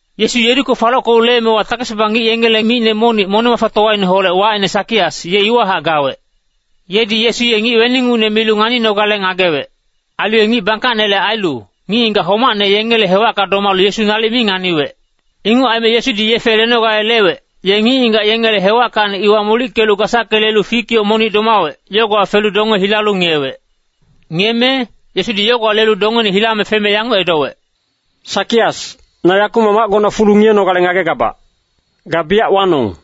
Yesu Yeriko falockelu leemewa takes-baba ngic yengele micne monic moneng-mafatowaineholec, wacine Sakias, ye iwahac gawec. Yedi Yesu ye ngic weningucne milu nganinogale ngagewec. Ailu ye ngic bangkacnele ailu, ngic-ngigac homacne yengele hewacka domalu Yesu nalic mi nganiwec. Inguc aime Yesudi yefe lenogale lewec, ye ngic-ngigac yengele hewackacni iwa molickelu gasacke lelu fik yoc monic domawec, yogowa felu donge hilalu ngiyewec. Ngiyeme Yesu ye yogowa lelu dongeine hilame feme yanguc edowec, “Sakias, na yakumac macgona fulu ngiyenogale ngagegabac. Ga biyac wanong.”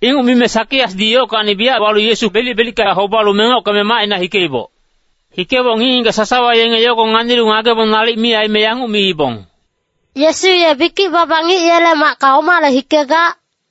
Inguc mime Sakiasdi yockacni biyac walu Yesu belic-belicka hobalu mengockeme macina hikeiboc. Hikeboc ngic-ngigac sasawa yenge yogo nganilu ngagebong nalic mi aime yanguc miibong, “Yesu ye bikic-baba ngic yele macka omale hikegac?”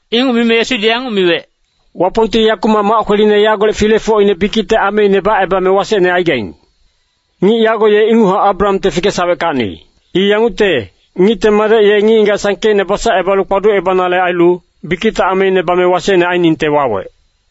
Inguc mime Yesudi yanguc miwec, “Wapongti yakumac mac kweline yagolec filefocine bikicte ameine bacebame wasecne aigaing. Ngic yago ye inguchac Abrahamte fikesaweckacni. I yangucte, Ngicte Madec ye ngic-ngigac sangkeicne basacebalu kpaducebanale ailu, bikicte ameine bame wasecne ainingte wawec.”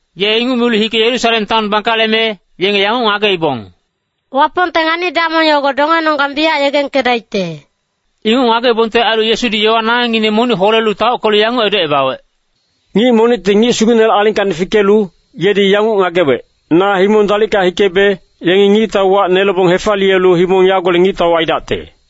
Ye inguc milu hike Yerusalem taon bangkaleme, yenge yanguc ngageibong, “Wapongte ngani-damong yogo dongenonggang biyac yegengkedaicte.” Inguc ngageibongte ailu Yesudi yowa nangengngine monic holelu taockelu yanguc edocebawec, “Ngic monicti ngic sugucnele alingkacni fikelu, yedi yanguc ngagewec, ‘Na himong dalicka hikebe, yengi ngictau wac nelebong hefaliyelu himong yagolec ngictau aidacte.’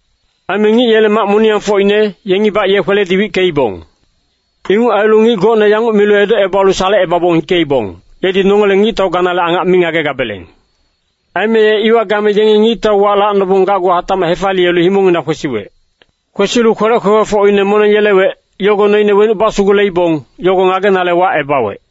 “Aime ngic yele mac moniyangfocine, yengibac ye kweledi wickeibong. Inguc ailu ngic gocne yanguc milu edocebalu salecebabong hikeibong, ‘Yedi nongele ngictau ganale angac mi ngagegabeleng.’ “Aime ye iwa game yengi ngictau wac lacnobong gacgu hatacmac hefaliyelu himongngina kwesiwec. Kwesilu kwelec kwekwefocine moneng yelewec, yogo noine wenuc basuguleibong, yogo ngagenale wacebawec.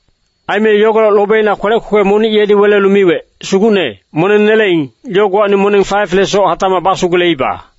“Aime yogolec lobeina kwelec kwekwe monic yedi welelu miwec, ‘Sugucne, moneng neleing, yogowacni moneng 5lesoc hatacmac basuguleiba.’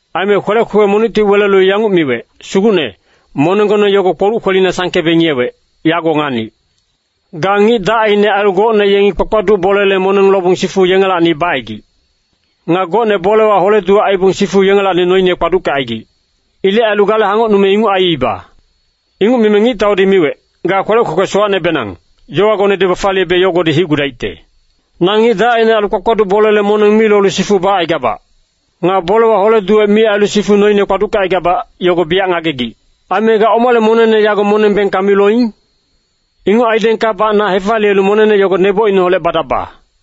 “Aime kwelec kwekwe monicti welelu yanguc miwec, ‘Sugucne, monenggone yogo kpoluc kwelina sangkebe ngiyewec, yago nganic. Ga ngic dacine ailu gocne yengi kpakpaduc bolele moneng lobong sifu yengelacni bacaigic. Nga gocne bolewa hole-duwec aibong sifu yengelacni noine kpaduckecaigic. Ilec ailu gale hangocnume inguc aiiba.’ “Inguc mime ngictaudi miwec, ‘Ga kwelec kwekwe sowacnebenang, yowagone bafaliyebe yogodi hicgudaicte. Na ngic dacine ailu kpakpaduc bolele moneng mi lolu sifu bacaigabac. Nga bolewa hole-duwec mi ailu sifu noine kpaduckecaigabac, yogo biyac ngagegic. Aime ga omale monengne yago moneng bengka mi loing? Inguc aidengkabac na hefaliyelu monengne yogo nebocineholec badaba.’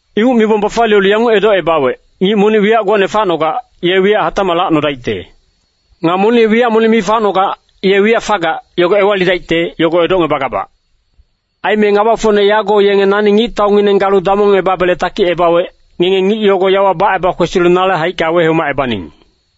“Inguc mibong bafaliyelu yanguc edocebawec, ‘Ngic monic wiyac gocne facnogac, ye wiyac hatacmac lacnodaicte. Nga monic ye wiyac monic mi facnogac, ye wiyac fagac, yogo ewalidaicte, yogo edocngebagabac. Aime ngabafocne yago yenge nani ngictaungineng galu damongebabele takicebawec, ngenge ngic yogo yawa baceba kwesilu nale haicka wehomacebaning.’”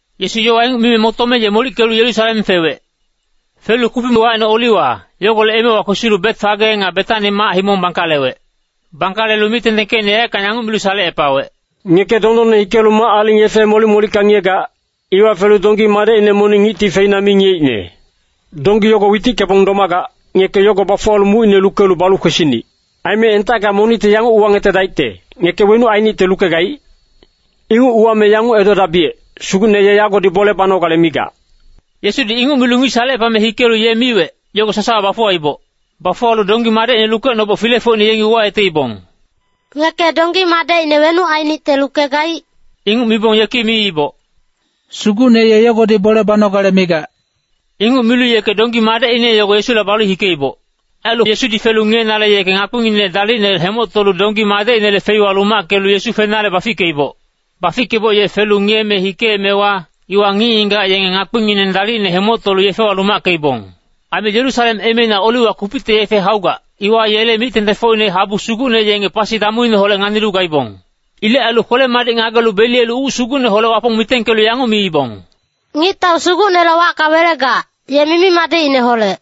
Yesu yowa inguc mime motome ye molickelu Yerusalem fewec. Felu kupic wacine Oliwa, yogolec emewa kwesilu Betfage nga Betani mac-himong bangkalewec. Bangkalelu mic-tengtengkecine yaeckang yanguc milu salecepawec, “Ngeke dondonne hikelu mac-aling yefe molic-molicka ngiyegac, iwa felu donggi madecine monic ngicti feina mi ngiyeicne. Donggi yogo witickebong domagac, ngeke yogo bafuwalu mucine lukelu balu kwesinic. Aime entacka monicti yanguc uwangetedaicte, ‘Ngeke wenuc ainicte lukegaic?’ Inguc uwame yanguc edodabiyec, ‘Sugucne ye yagodi bole banogale migac.’” Yesudi inguc milu ngic salecepame hikelu ye miwec, yogo sasawa bafuwaiboc. Bafuwalu donggi madecine lukeboc filefocine yengi yanguc uwayeteibong, “Ngeke donggi madecine wenuc ainicte lukegaic?” Inguc mibong yeki miiboc, “Sugucne ye yagodi bole banogale migac.” Inguc milu yeke donggi madecine yogo Yesula balu hikeiboc. Ailu Yesudi felu ngiyenale yeke ngakpinginec dalicne hemoctolu donggi madecinele feiwa lumackelu Yesu fenale bafickeiboc. Bafickeboc ye felu ngiyeme hikeemewa, iwa ngic-ngigac yenge ngakpingineng dalicne hemoctolu yefewa lumackeibong. Aime Yerusalem emeina Oliwa kupicte yefe haugac, iwa yele mic-tengtengfocine habu sugucne yenge pasi damuineholec nganilu gaibong. Ilec ailu kwele-madic ngagelu beliyelu uc sugucneholec Wapong mitengkelu yanguc miibong, “Ngictau Sugucnele wacka welegac, ye mimi-madicineholec.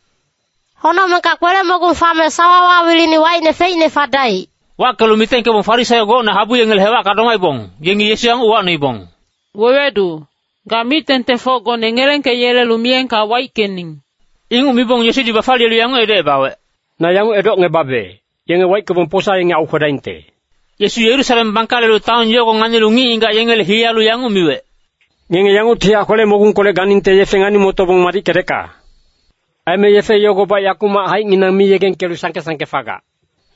Honocmengka kwele-mogung fame sawawa wilini wacine feicne fadaic.” Wackelu mitengkebong Farisaio gocne habu yengele hewacka domaibong, yengi Yesu yanguc uwacnoibong, “Wewedu, ga mic-tengtengfocgone ngelengkeyelelu miyengka waickening.” Inguc mibong Yesudi bafaliyelu yanguc edocebawec, “Na yanguc edocngebabe, yenge waickebong posa yengi aukwedaingte.” Yesu Yerusalem bangkalelu taon yogo nganilu ngic-ngigac yengele hiyalu yanguc miwec, “Ngenge yanguctihac kwele-mogungkolec ganingte yefe ngani-motobong madickedecka. Aime yefe yogobac yakumac haicnginang mi yegengkelu sangke-sangke fagac.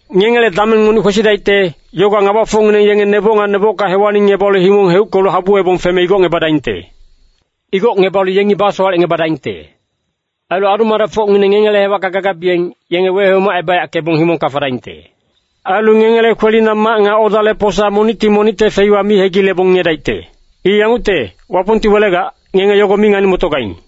Ngengele dameng monic kwesidaicte, yogowa ngabafocngineng yenge neboc nga nebocka hewalingngebalu himong heuckelu habuwebong feme igocngebadaingte. Igocngebalu yengi basowalecngebadaingte. Ailu adu-madecfocngineng ngengele hewacka gagabiyeng, yenge wehomacebayackebong himongka fadaingte. Ailu ngengele kwelina mac nga odale posa monicti monicte feiwa mi hegilebong ngiyedaicte. I yangucte, Wapongti welegac, ngenge yogo mi ngani-motogaing.”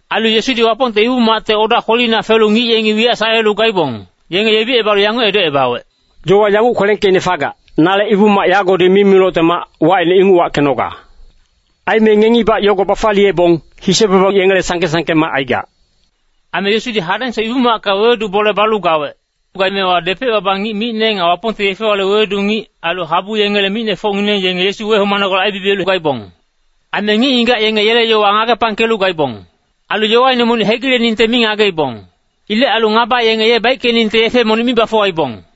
Ailu Yesudi Wapongte Ibu-macte oda kwelina felu ngic yengi wiyac salelu gaibong, yenge yebicebalu yanguc edocebawec, “Yowa yanguc kwelengkeicne fagac, ‘Nale Ibu-mac yagodi mimilocte mac, wacine inguc wackenoga.’ Aime ngengibac yogo bafaliyebong, ‘Hise-baba yengele sangke-sangke mac aigac.’” Aime Yesudi hadengsoc Ibu-macka wewedu bole balu gawec. Gaemewa depec-baba ngic micne nga Wapongte yefe-yowale wewedu ngic, ailu habu yengele micnefocngineng yenge Yesu wehomanogale aibibiyelu gaibong. Aime ngic-ngigac yenge yele yowa ngagepangkelu gaibong. Ailu yowaine monic hegileningte mi ngageibong. Ilec ailu ngaba yenge ye baickeningte yefe monic mi bafuwaibong.